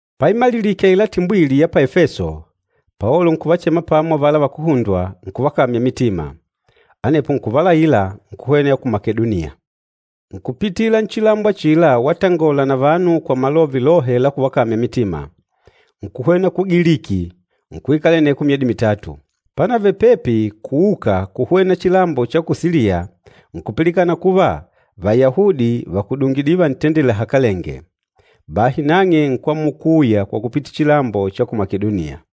Paimalilike aila timbwili ya pa Efeso, Paolo nkuvachema pamo avala vakuhundwa, nkuvakamya mitima. Anepo nkuvalaila, nkuhwena ya ku Makedoniya. Nkupitila nchilambo achila watangola na vanu kwa malove lohe la kuvakamya mitima. Nkuhwena ku Giliki, nkuikala aneko myedi mitatu. Panavele pepi kuuka kuhwena chilambo cha ku Siliya, nkupilikana kuva Vayahudi vàkudungidile vantendela lahakalenge. Bahi nang'e nkwamula kuuya kwa kupitila chilambo cha ku Makedoniya.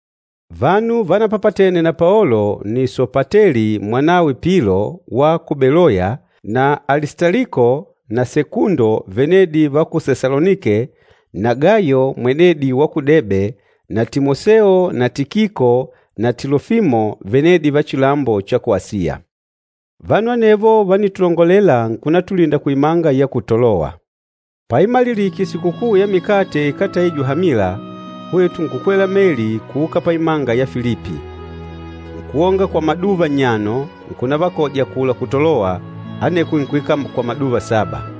Vanu vanapapatene na Paolo nni Sopateli mwanawe Pilo wa ku Beloya na Alistaliko na Sekundo venedi va ku Sesalonike na Gayo mwenedi wa ku Debe na Timoseo na Tikiko na Tilofimo venedi va chilambo cha ku Asiya. Vanu anevo vánitulongolela nkunatulinda kuimanga ya ku Tolowa. Paimalilike Sikukuu ya Mikate Ikátaijwe Hamila, hwetu nkukwela meli kuuka paimanga ya Filipi. Nkuonga kwa maduva nnyano, nkunavakoja akula ku Tolowa, aneko nkuikala kwa maduva saba.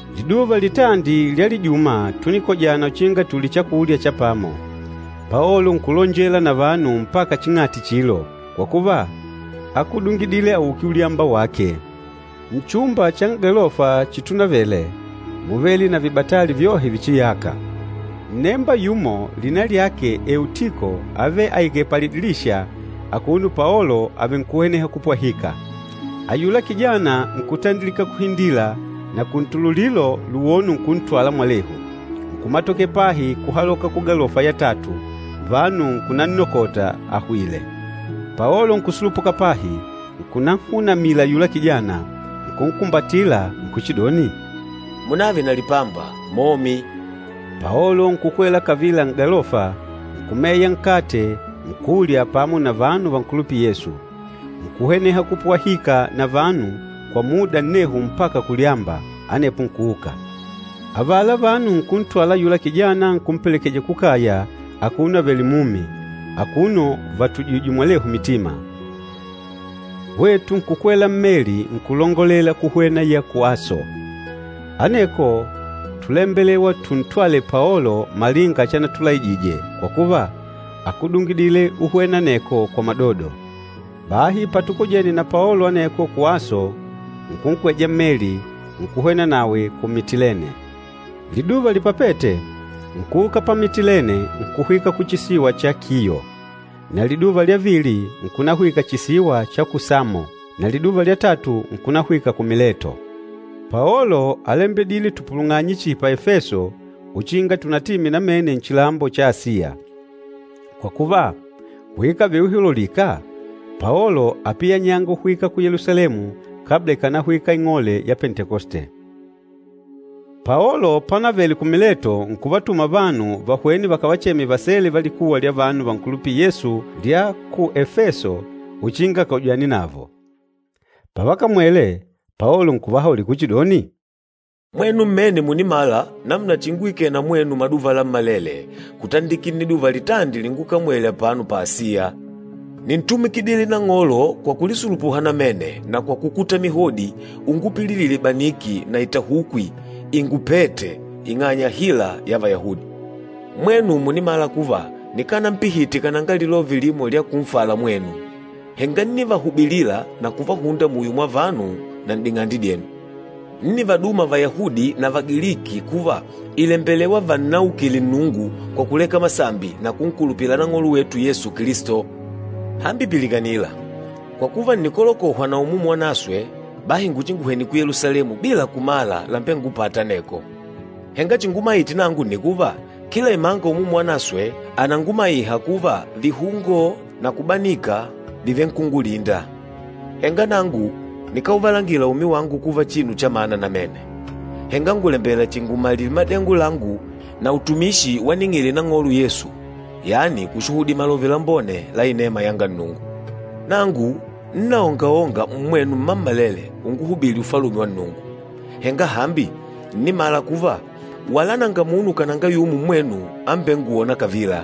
Liduva litandi lya lijuma túnikojana uchinga tulye chakulya cha pamo. Paolo nkulonjela na vanu mpaka ching'ati chilo, kwa kuva, ákudungidile auke ulyamba wake. Nchumba cha n'galofa chitunavele, múvele na vibatali vyohe vichiyâka. Nnemba yumo lina lyake Eutiko ávele aikèlè palidilisha akuno Paolo avenkuhweneha kupwahika. Ayula kijana nkutandilika kuhindila na kuntululilo luwono nkuntwala mwalehu, nkumatokela pahi kuhaloka kugalofa ya tatu, vanu nkunannokota ahwìlè. Paolo nkusulupuka pahi, nkunanhunamila ayula kijana, nkunkumbatila nkuchidoni, “Munave na lipamba, momi.” Paolo nkukwela kavila n'galofa, nkumeya nkate nkulya pamo na vanu vankulupîla Yesu. Nkuhweneha kupwahika na vanu kwa muda nnehu mpaka kulyamba, anepo nkuuka. Avala vanu nkuntwala ayula kijana nkumpelekeja kukaya akuno avèlè mumi, akuno vatujìjwè mwalehu mitima. Hwetu nkukwela mmeli nkulongolela nkuhwena ya ku Aso. Aneko túlembelewa tuntwale Paolo malinga chanatulaijije, kwa kuva, ákudungidile uhwena aneko kwa madodo. Bahi patukojene na Paolo aneko ku Aso, nkunkweja mmeli, nkuhwena nawe ku Mitilene. Liduva lipapête, nkuuka pa Mitilene nkuhwika ku chisiwa cha Kiyo, na liduva lya vili nkunahwika chisiwa cha ku Samo, na liduva lya tatu nkunahwika ku Mileto. Paolo álembedile tupulung'anye chihi pa Efeso uchinga tunatime namene nchilambo cha Asiya. Kwa kuva, kuikave uihululika Paolo ápiyanyanga ahwike ku Yelusalemu kabla ikànahwika Sikukuu ya Pentekoste. Paolo panavele ku Mileto nkuvatuma vanu vahwene vakavacheme vasele va likuwa lya vanu vankulupîla Yesu lya ku Efeso uchinga akojane navo. Pavakamwele, Paolo nkuvahaulila kuchidoni, “Mwenu mmene mùnimala namuna chinguikele na mwenu maduva lammalele kutandikila nniduva litandi lingukamwele apano pa Asiya. Níntumikidile Nang'olo kwa kulisulupuha namene na kwa kukuta mihodi ungupililìlà ibaniki na itahukwi íngupètè ing'anya ya hila ya Vayahudi. Mwenu mùnimala kuva nikanampihite kananga lilove limo lya kunfala mwenu, henga ńnivahubilila na kuvahunda muyo mwa vanu na n'ding'ande dyenu. Ńnivaduma Vayahudi na Vagiliki kuva ìlembelewa vannaukile Nnungu kwa kuleka masambi na kunkulupila Nang'olo wetu Yesu Kilisto. Hambi pilikanila! Kwa kuva ǹnikolokohwa na Umumu Wanaswe, bahi nguchinguhwene ku Yelusalemu bila kumala lámbengupàtà aneko. Henga chingumaite nangu nni kuva, kila imanga Umumu Wanaswe ànangumaiha kuva vihungo na kubanika vìvenkungulinda. Henga nangu nikáuvalangila umi wangu kuva chinu chamana namene, henga ngùlembela chihi ngumalile madengo langu na utumishi waning'ile Nang'olo Yesu, yani kushuhudila Malove Lambone la inema yanga Nnungu. Nangu ńnaongaonga mmwenu mmammalele unguhubìlì Ufalume wa Nnungu. Henga hambi, ǹnimala kuva wala nanga munu kananga yumo mmwenu ambengwôna kavila.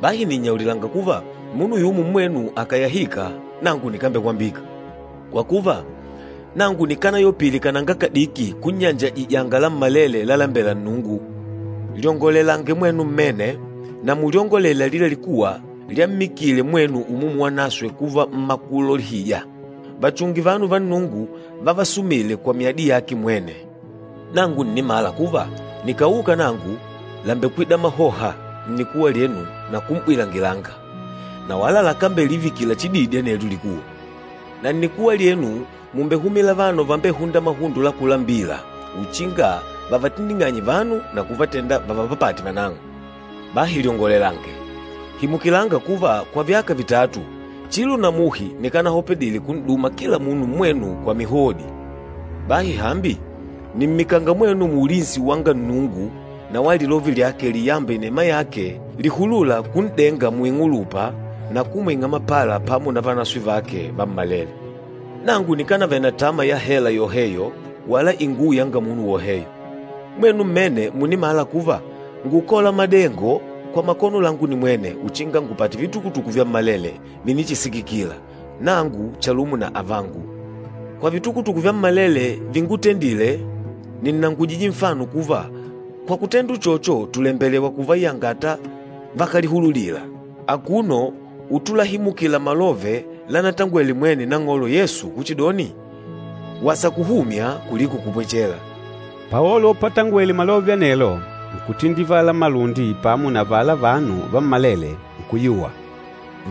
Bahi nìnnyaulila kuva munu yumo mmwenu akàyahika nangu nikambekwambika. Kwa kuva, nangu nikanayopile kananga kadiki kunnyanjajija lammalele lalalembela Nnungu. Lyongolelange mwenu mmene na mulyongolele alila likuwa lyammikile mwenu Umumu Wanaswe kuva mmakulolihija. Vachunge vanu va Nnungu vavasumîle kwa myadi yake mwene. Nangu ǹnimala kuva nikàuka nangu, làmbekwida mahoha nnikuwa lyenu na kum'bwilangilanga, na wala lakambelivikila chididi anelyo likuwa. Na nnikuwa lyenu mùmbehumila vanu vambehûnda mahundo la kulambila uchinga vavatindinganye vanu na kuvatenda vavapapate vanang'o. Bahi lyongolelange! Himukilanga kuva kwa vyaka vitatu, chilo na muhi nikanahopedile kun'duma kila munu mmwenu kwa mihodi. Bahi hambi, nìmmikanga mwenu muulinsi wanga Nnungu na wa lilove lyake liyamba inema yake lìhulula kun'denga muing'ulupa na kumwing'a mapala pamo na vanaswe vake vammalele. Nangu nikanavele na tama ya hela yoheyo wala inguwo yanga munu woheyo. Mwenu mmene mùnimala kuva ngúkola madengo kwa makono langu nimwene uchinga ngupate vitukutuku vyammalele vinichisikikila, nangu chalumo na avangu. Kwa vitukutuku vyammalele víngutendìlè, nìnnangujije nfano kuva kwa kutenda uchocho tùlembelewa kuvayangata vakálihululila, akuno utulahimukila malove lanatangwele mwene Nang'olo Yesu kuchidoni, ‘Wasa kuhumya kuliko kupwechela.’” Paolo patangwele malove anelo, nkutindivala malundi pamo na avala vanu vammalele, nkuyuwa.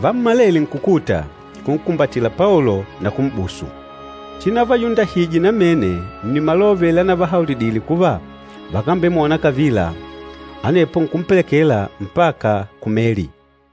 Vammalele nkukuta, nkunkumbatila Paolo na kum'busu. Chinavayundahije namene nni malove lanavahaulidile kuva vakambemwona kavila. Anepo nkumpelekela mpaka ku meli.